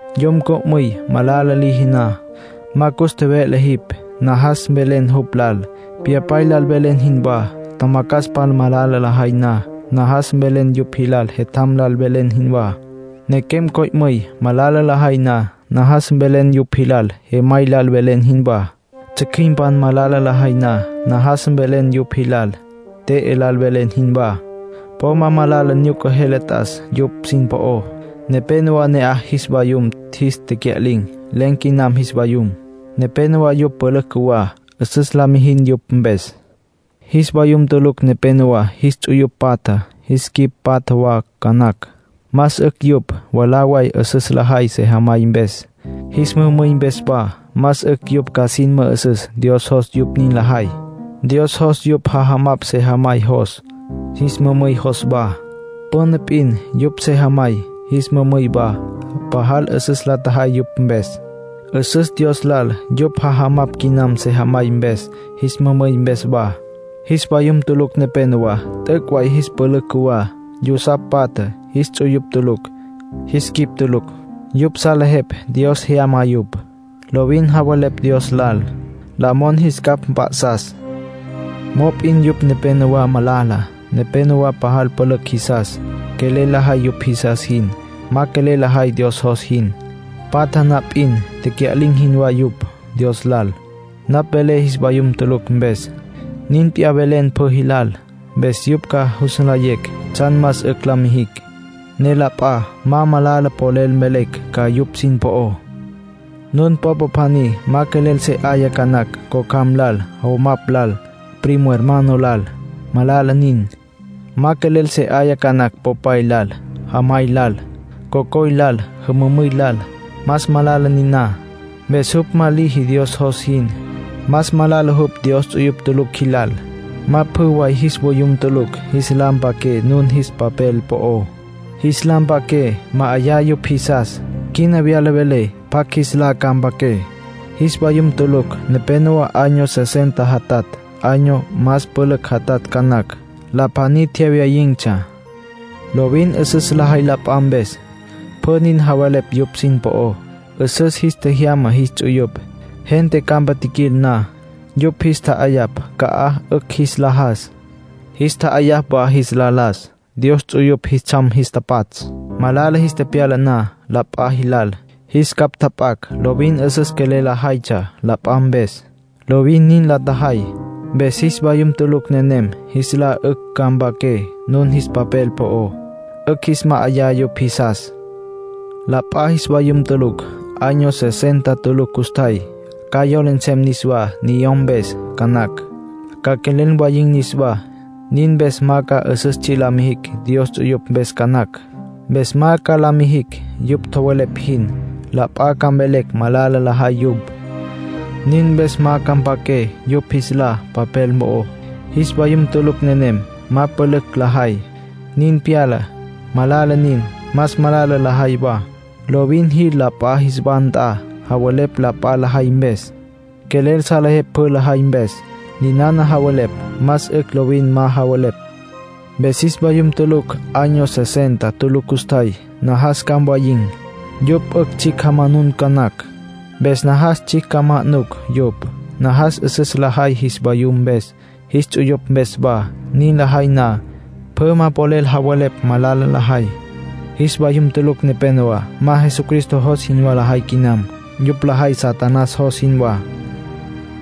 Yom co'müy malala liji na, ma cus tjeve'le jipj. Najas mvelen jupj lal, pyapay lal velen jinwá. Tjamacjaspan malala lajay na, najas mvelen yupj jilal jetjam lal velen jinwá. Nequem co'müy malala lajay na, najas mvelen yupj jilal jemay lal velen jinwá. Tsjücjüimpan malala lajay na, najas mvelen yupj jilal te'e lal velen jinwá. Po ma malala nyuca jele t'as yupj sin po'ó. Nepénowa ne'aj jis vayum jis tecya'lin̈. Len̈ quinam jis vayum. Nepénowa yupj pülücj cjuwá. 'Üsüs la mijin yupj mpes. Jis vayum tulucj nepenowá jis ts'uyupj patja, jis quicj patja wa ca nacj. Más 'ücj yupj mwalá way 'üsüs lajay sejamay mpes, jis mümüy mpes wa. Más 'ücj yupj ca sin mü'üsüs Dios jos yupj nin lajay. Dios jos yupj ja'ayapj sejamay jos, jis mümüy jos wa. Püna p'in yupj sejamay, jis mümüy wa, pajal 'üsüs la tjajay yupj mpes. 'Üsüs Dios lal yupj ja'ayapj quinam sejamay mpes, jis mümüy mpes wa. Jis vayum tulucj nepénowa t'üc' way jis pülücj cjuwá. Yusapj patja. Jis ts'uyupj tulucj. Jis quicj tulucj. Yupj salejepj Dios jyama yupj. Lovin javelepj Dios lal, la mon jis capj mp'a'sas. Mop'in yupj nepénowa malala. Nepénowa pajal pülücj jisas. Quelel lajay yupj jisas jin, ma quelel lajay Dios jos jin. Patja na p'in tecya'lin̈ jinwá yupj Dios lal. Napj velé jis vayum tulucj mpes, nin p'iyá mvelen pjü jilal. Mpes yupj ca jus nlayecj tsjan más 'ücj la mijicj, ne la p'a ma malala polel mvelecj ca yupj sin po'ó. Nun popa pjaní ma quelel se 'aya ca nacj cocjam lal, jomapj lal, primo hermano lal; malala nin. Ma quelel se 'aya ca nacj popay lal, jamay lal, cocoy lal, jümümüy lal; más malala niná. Mpes jupj ma liji Dios jos jin. Más malala jupj Dios ts'uyupj tulucj jilal. Ma pjü way jis vayum tulucj jis lá mpaqué nun jis papel po'ó. Jis lá mpaqué, ma'ayá yupj jisas. Quina wyala velé pjacj jis lá ca mpaqué. Jis vayum tulucj nepénowa año sesenta jatatj, año más pülücj jatatj ca nacj. La pjaní tjewyayin̈tsja. Lovin 'üsüs lajay la p'a mpes. Pjü nin javelepj yupj sin po'ó. 'Üsüs jis tjejyama jis ts'uyupj. Gente campa tjiquil na, yupj jis tja'ayapj ca'aj 'ücj jis la jas, jis tja'ayapj wa jis la las. Dios ts'uyupj jis tsjam jis tapatsj. Malala jis tepyala na la p'a jilal, jis capj tjap'acj. Lovin 'üsüs quelel lajaytsja la p'a mpes. Lovin nin la tjajay. Mpes jis vayum tulucj nenem jis lá 'ücj ca mpaqué nun jis papel po'ó. 'Ücj jis ma'ayá yupj jisas. La p'a jis vayum tulucj año sesenta tulucj custjay. Ca yola nsem niswá niyom mpes ca nacj, ca quelel mwayin̈ niswá. Nin mpes ma ca 'üsüs tsji' la mijicj Dios ts'uyupj mpes ca nacj. Mpes ma ca la mijicj yupj tjowelepj jin. La p'a ca mvelecj malala lajay yupj. Nin mpes ma ca mpaqué yupj jis lá papel mo'ó. Jis vayum tulucj nenem ma pülücj lajay, nin pyala. Malala nin. Más malala lajay wa. Lovin jil la p'a jis wa nt'a, javelepj la p'a lajay mpes. Quelel salejepj pjü lajay mpes. Ninana javelepj más 'ücj lovin ma javelepj. Mpes jis vayum tulucj año sesenta tulucj custjay, najas ca mwayin̈. Yupj 'ücj tsjicj jamanun ca nacj. Mpes najas tsjicj ca ma'nucj yupj. Najas 'üsüs lajay jis vayum mpes, jis ts'uyupj mpes wa. Nin lajay na, pjü ma polel javelepj malala lajay. Jis vayum tulucj nepénowa ma Jesucristo jos jinwá lajay quinam. Yupj lajay Satanás jos jinwá.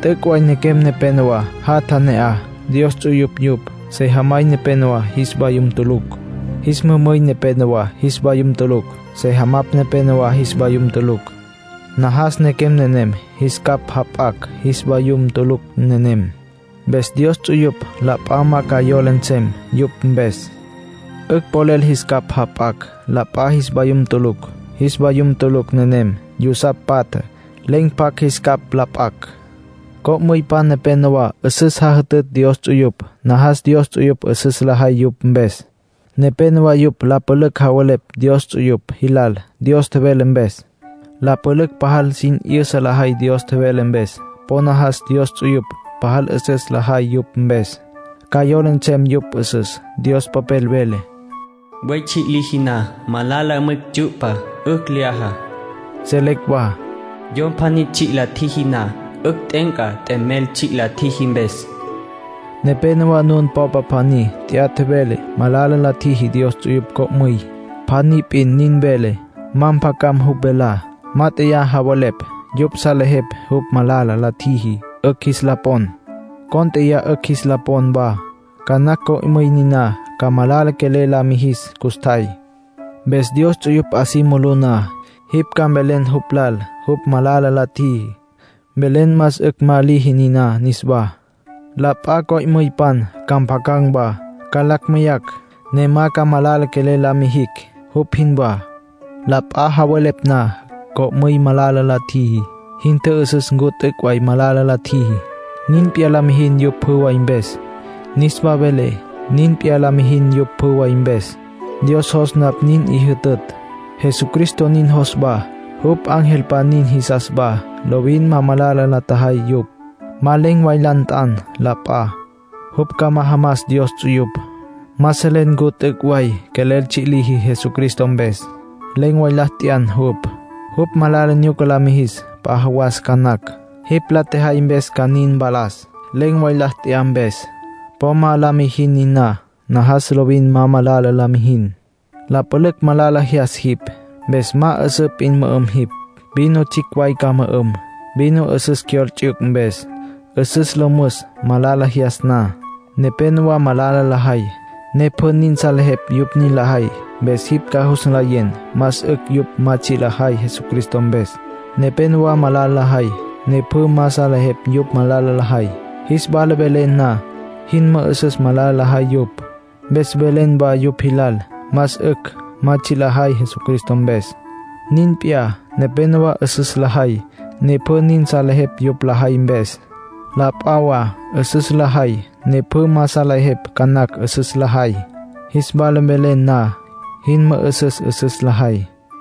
T'üc' way nequem nepénowa jatja ne'aj, Dios ts'uyupj yupj. Sejamay nepénowa jis vayum tulucj. Jis mümüy nepénowa jis vayum tulucj. Sejamapj nepénowa jis vayum tulucj. Najas nequem nenem jis capj jap'acj jis vayum tulucj nenem. Mpes Dios ts'uyupj la p'a ma ca yola nsem yupj mpes. 'Ücj polel jis capj jap'acj la p'a jis vayum tulucj. Jis vayum tulucj nenem yusapj patja, len̈ pjacj jis capj la p'acj. Co'müypan nepénowa 'üsüs jajütütj Dios ts'uyupj. Najas Dios ts'uyupj 'üsüs lajay yupj mpes. Nepénowa yupj la pülücj javelepj Dios ts'uyupj jilal Dios tjevele mpes. La pülücj pajal sin 'yüsa lajay Dios tjevele mpes. Po najas Dios ts'uyupj pajal 'üsüs lajay yupj mpes. Ca yola nsem yupj 'üsüs. Dios Popel vele: “Buey tsji' liji na, malala mwicj tsyu'pa. 'Ücj lyaja.” Selecj wa: “Yom pjaní tsji' la tjiji na, 'ücj t'e'enca t'emel tsji' la tjiji mpes”. Nenéyawa nun popa pjaní t'ya vele malala la tjiji Dios ts'uyupj co'müy. Pjaní p'in nin vele, ma mpjacam jupj velá. Mát'eya javelepj yupj salejepj jupj malala la tjiji, 'ücj jis la pon. Cónt'eya 'ücj jis la pon wa. Ca nacj co'müy niná ca malala quelel la mijis custjay. Mpes Dios ts'uyupj 'a si mulú na, jipj ca mvelen jupj lal jupj malala la tjiji. Mvelen más 'ücj ma liji niná niswá. La p'a co'müypan ca mpjacan̈ wa, ca lacj meyacj, ne ma ca malala quelel la mijicj, jupj jinwá. La p'a javelepj na co'müy malala la tjiji, jin tjü'üsüs ncu t'üc' way malala la tjiji. Nin p'iyá la mijin yupj pjü way mpes. Niswa velé, nin p'iyá la mijin yupj pjü way mpes. Dios jos napj nin 'i jütütj. Jesucristo nin jos wa. Jupj angelpan nin jisas wa, lovin ma malala la tjajay yupj. Ma len̈ way la nt'an la p'a, jupj ca majamas Dios ts'uyupj. Ma selen ncu t'üc' way quelel tsji' liji Jesucristo mpes. Len̈ way la t'yan jupj, jupj malala nyuca la mijis p'a jawas ca nacj. Jipj la tjejay mpes ca nin mpalas, len̈ way la t'yan mpes. Po ma la mijin niná. Najas lovin ma malala la mijin. La pülücj malala jyas jipj. Mpes ma 'üsǘ p'in mü'üm jipj. Vino tsjicj way ca mü'üm. Vino 'üsüs cyol ts'yuc mpes. 'Üsüs lo müs malala jyas na. Nepénowa malala lajay, ne pjü nin salejepj yupj nin lajay. Mpes jipj ca jus nlayen más 'ücj yupj ma tsji' lajay Jesucristo mpes. Nepénowa malala lajay, ne pjü ma salejepj yupj malala lajay. Jis wala velen na, jin mü'üsüs malala lajay yupj. Mpes mvelen wa yupj jilal más 'ücj ma tsji' lajay Jesucristo mpes. Nin p'iyá, nepénowa 'üsüs lajay, ne pjü nin salejepj yupj lajay mpes. La p'a wa 'üsüs lajay, ne pjü ma salejepj ca nacj 'üsüs lajay. Jis wala velen na, jin mü'üsüs 'üsüs lajay.